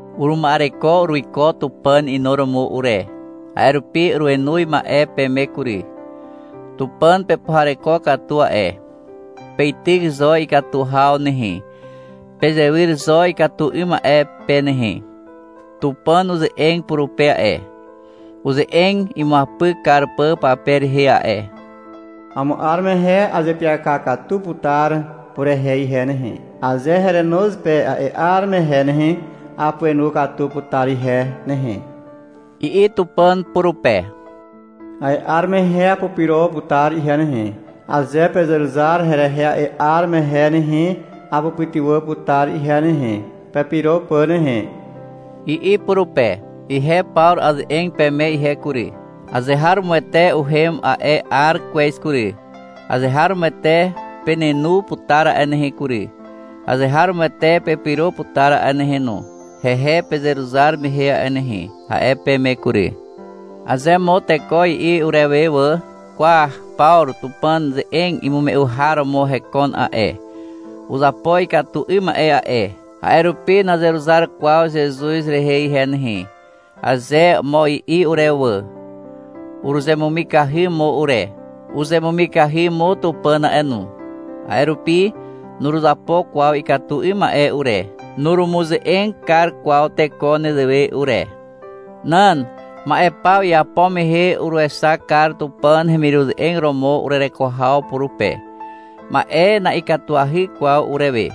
Uruma'ereko uruiko Tupàn inuromo ure. A'e rupi urenoz ma'e peme kury. Tupàn pepuhareko katu a'e. Peityk zo ikatu haw nehe. Pezewyr zo ikatu 'ym ma'e pe nehe. Tupàn uze'eg purupe a'e, uze'eg imuapyk kar pà pape rehe a'e. — Amo 'ar mehe azeapyaka katu putar purehe ihe nehe. Aze herenoz pe a'e 'ar mehe nehe, apuenu katu putar ihe nehe, i'i Tupàn purupe. — A'e 'ar mehe apurupyro putar ihe nehe. Aze pezeruzar herehe a'e 'ar mehe nehe, apupytywà putar ihe nehe, pepyro pà nehe, i'i purupe. Ihe Pawru aze'eg peme ihe kury. — Azeharomoete uhem a'e 'ar kwez kury. Azeharomoete penenu putar a'e nehe kury, azeharomoete pepyro putar a'e nehe no, hehe pezeruzar mehe a'e nehe, a'e peme kury. Aze mo teko i'i urewe wà, — Kwa, Pawru Tupàn ze'eg imume'u har romo hekon a'e. Uzapo ikatu 'ym ma'e a'e, a'e rupi nazeruzar kwaw Zezuz rehe ihe nehe, aze mo i'i urewe wà, uruzemumikahy mo ure. Uzemumikahy mo Tupàn a'e no. A'e rupi nuruzapo kwaw ikatu 'ym ma'e ure, nurumuze'eg kar kwaw teko nezewe ure. Nan. Ma'e paw iapo mehe uruexak kar Tupàn hemiruze'eg romo urereko haw purupe. Ma'e na'ikatuahy kwaw urewe.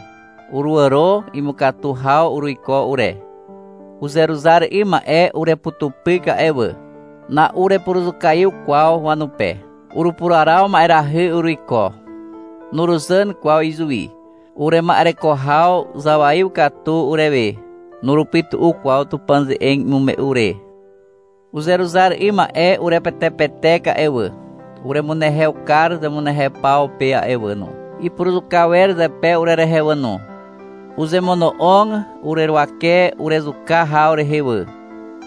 Uruàro imukatu haw uruiko ure. Uzeruzar 'ym ma'e ureputupyk a'e wà. Na'urepuruzukaiw kwaw wanupe. Urupuraraw ma'erahy uruiko. Nuruzàn kwaw izuwi. Urema'ereko haw zawaiw katu urewe. Nurupytu'u kwaw Tupàn ze'eg imume'u re. Uzeruzar 'ym ma'e urepetepetek a'e wà. Uremunehew kar zemunehew paw pe wà no. Ipuruzuka wer zepe urerehe wà no. Uzemono'og ureruwake urezuka haw rehe wà.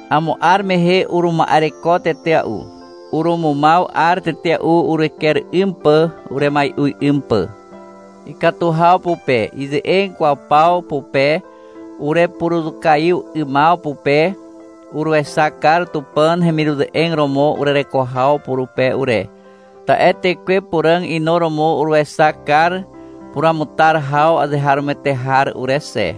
Amo 'ar mehe uruma'ereko tetea'u. Urumumaw 'ar tetea'u ureker 'ym pà uremai'u 'ym pà. Ikatu haw pupe, ize'eg kwaw paw pupe, urepuruzukaiw 'ymaw pupe, uruexak kar Tupàn hemiruze'eg romo urereko haw purupe ure. Ta'e Tekwe Puràg inuromo uruexak kar puruamutar haw azeharomoete har ure xe.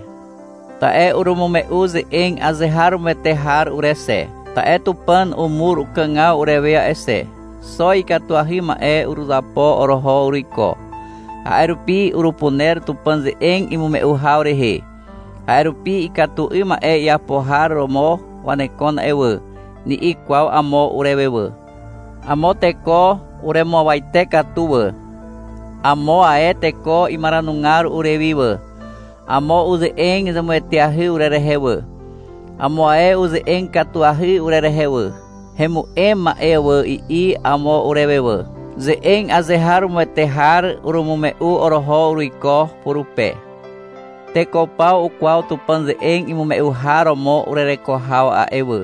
Ta'e urumume'u ze'eg azeharomoete har ure xe. Ta'e Tupàn umur ukàgaw urewe a'e xe. Xo ikatuahy ma'e uruzapo oroho uruiko. A'e rupi urupuner Tupàn ze'eg imume'u haw rehe. A'e rupi — Ikatu 'ym ma'e iapo har romo wanekon a'e wà, ni'i kwaw amo urewe wà. Amo teko uremuawate katu wà. Amo ae teko imaranugar urewi wà. Amo uze'eg zemueteahy urerehe wà. Amo ae uze'eg katuahy urerehe wà. — Hemu'em ma'e wà, i'i amo urewe wà. Ze'eg azeharomoete har urumume'u oroho uruiko purupe. Teko paw ukwaw Tupàn ze'eg imume'u har romo urereko haw a'e wà.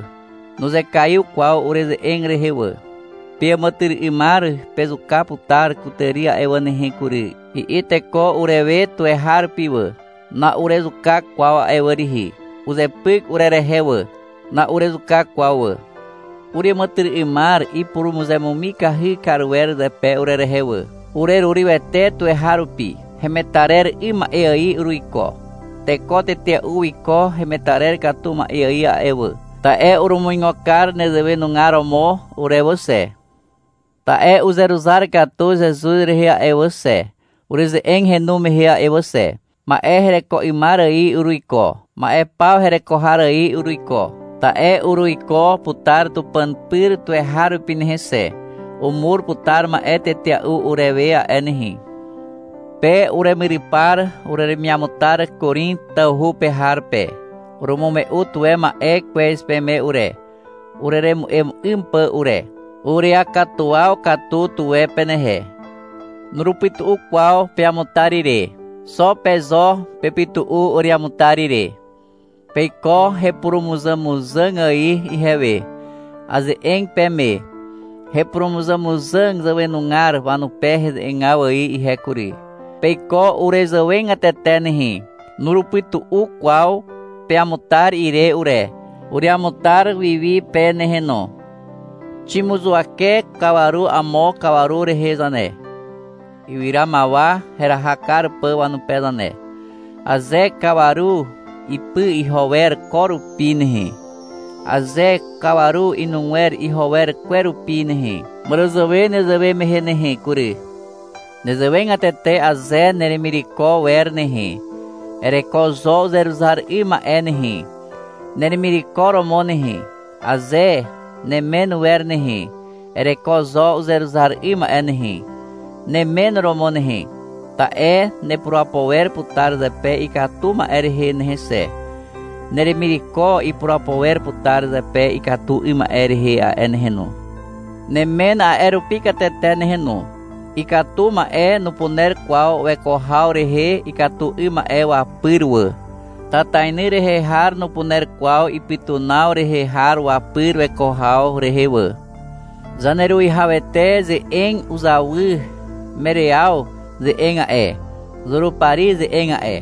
Nuzekaiw kwaw ureze'eg rehe wà. — Peàmàtyry'ymar pezuka putar kutàri a'e wà nehe kury, i'i teko urewe tuweharupi wà. Na'urezuka kwaw a'e wà rihi. Uzepyk urerehe wà. Na'urezuka kwaw wà. Ureàmàtyry'ymar ipurumuzemumikahy kar wer zepe urerehe wà. Urerurywete tuweharupi. Hemetarer 'ym ma'e ài uruiko. Teko tetea'u wiko hemetarer katu ma'e ài a'e wà, ta'e urumuigo kar nezewe nugar romo ure wà xe. Ta'e uzeruzar katu Zezuz rehe a'e wà xe, ureze'eg henu mehe a'e wà xe. Ma'e hereko 'ymar ài uruiko. Ma'e paw hereko har ài uruiko, ta'e uruiko putar Tupàn pyr tuweharupi nehe xe. Umur putar ma'e tetea'u urewe a'e nehe. Pe uremyrypar ureremiamutar Korin tawhu pe har pe. Urumume'u tuwe ma'e kwez peme ure, ureremu'em 'ym pà ure. Ureakatuwaw katu tuwe penehe. Nurupytu'u kwaw peamutar ire. Xo pe zo pepytu'u ureamutar ire. Peiko hepurumuzàmuzàg ài ihewe. Aze'eg peme hepurumuzàmuzàg zàwenugar wanupe heze'egaw ài ihe kury. Peiko urezàwegatete nehe. Nurupytu'u kwaw peamutar ire ure. Ureamutar wi wi pe nehe no. Ximuzuwake kawaru amo kawaru rehe zane, ywyramawa heraha kar pà wanupe zane. Aze kawaru ipy iho wer ko rupi nehe, aze kawaru inugwer iho wer kwe rupi nehe, màràzàwe nezewe mehe nehe kury. Nezewegatete aze neremireko wer nehe, ereko zo uzeruzar 'ym ma'e nehe, neremireko romo nehe. Aze nemen wer nehe, ereko zo uzeruzar 'ym ma'e nehe, nemen romo nehe. Ta'e nepurapo wer putar zepe ikatu ma'e rehe nehe xe, neremireko ipurapo wer putar zepe ikatu 'ym ma'e rehe a'e nehe no. Nemen a'e rupi katete nehe no. Ikatu ma'e nupuner kwaw weko haw rehe ikatu 'ym ma'e wapyr wà. Tatainy rehe har nupuner kwaw ipytunaw rehe har wapyr weko haw rehe wà. Zaneruwihawete ze'eg uzawy Meriaw ze'eg a'e, Zurupari ze'eg a'e.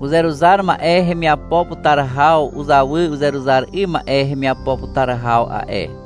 Uzeruzar ma'e hemiapo putar haw uzawy uzeruzar 'ym ma'e hemiapo putar haw a'e.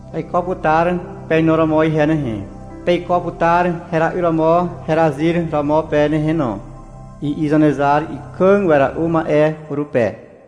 Aiko putar penu romo ihe nehe. Peiko putar hera'yr romo herazyr romo pe nehe no, i'i Zanezar Ikàg Wera'u Ma'e purupe.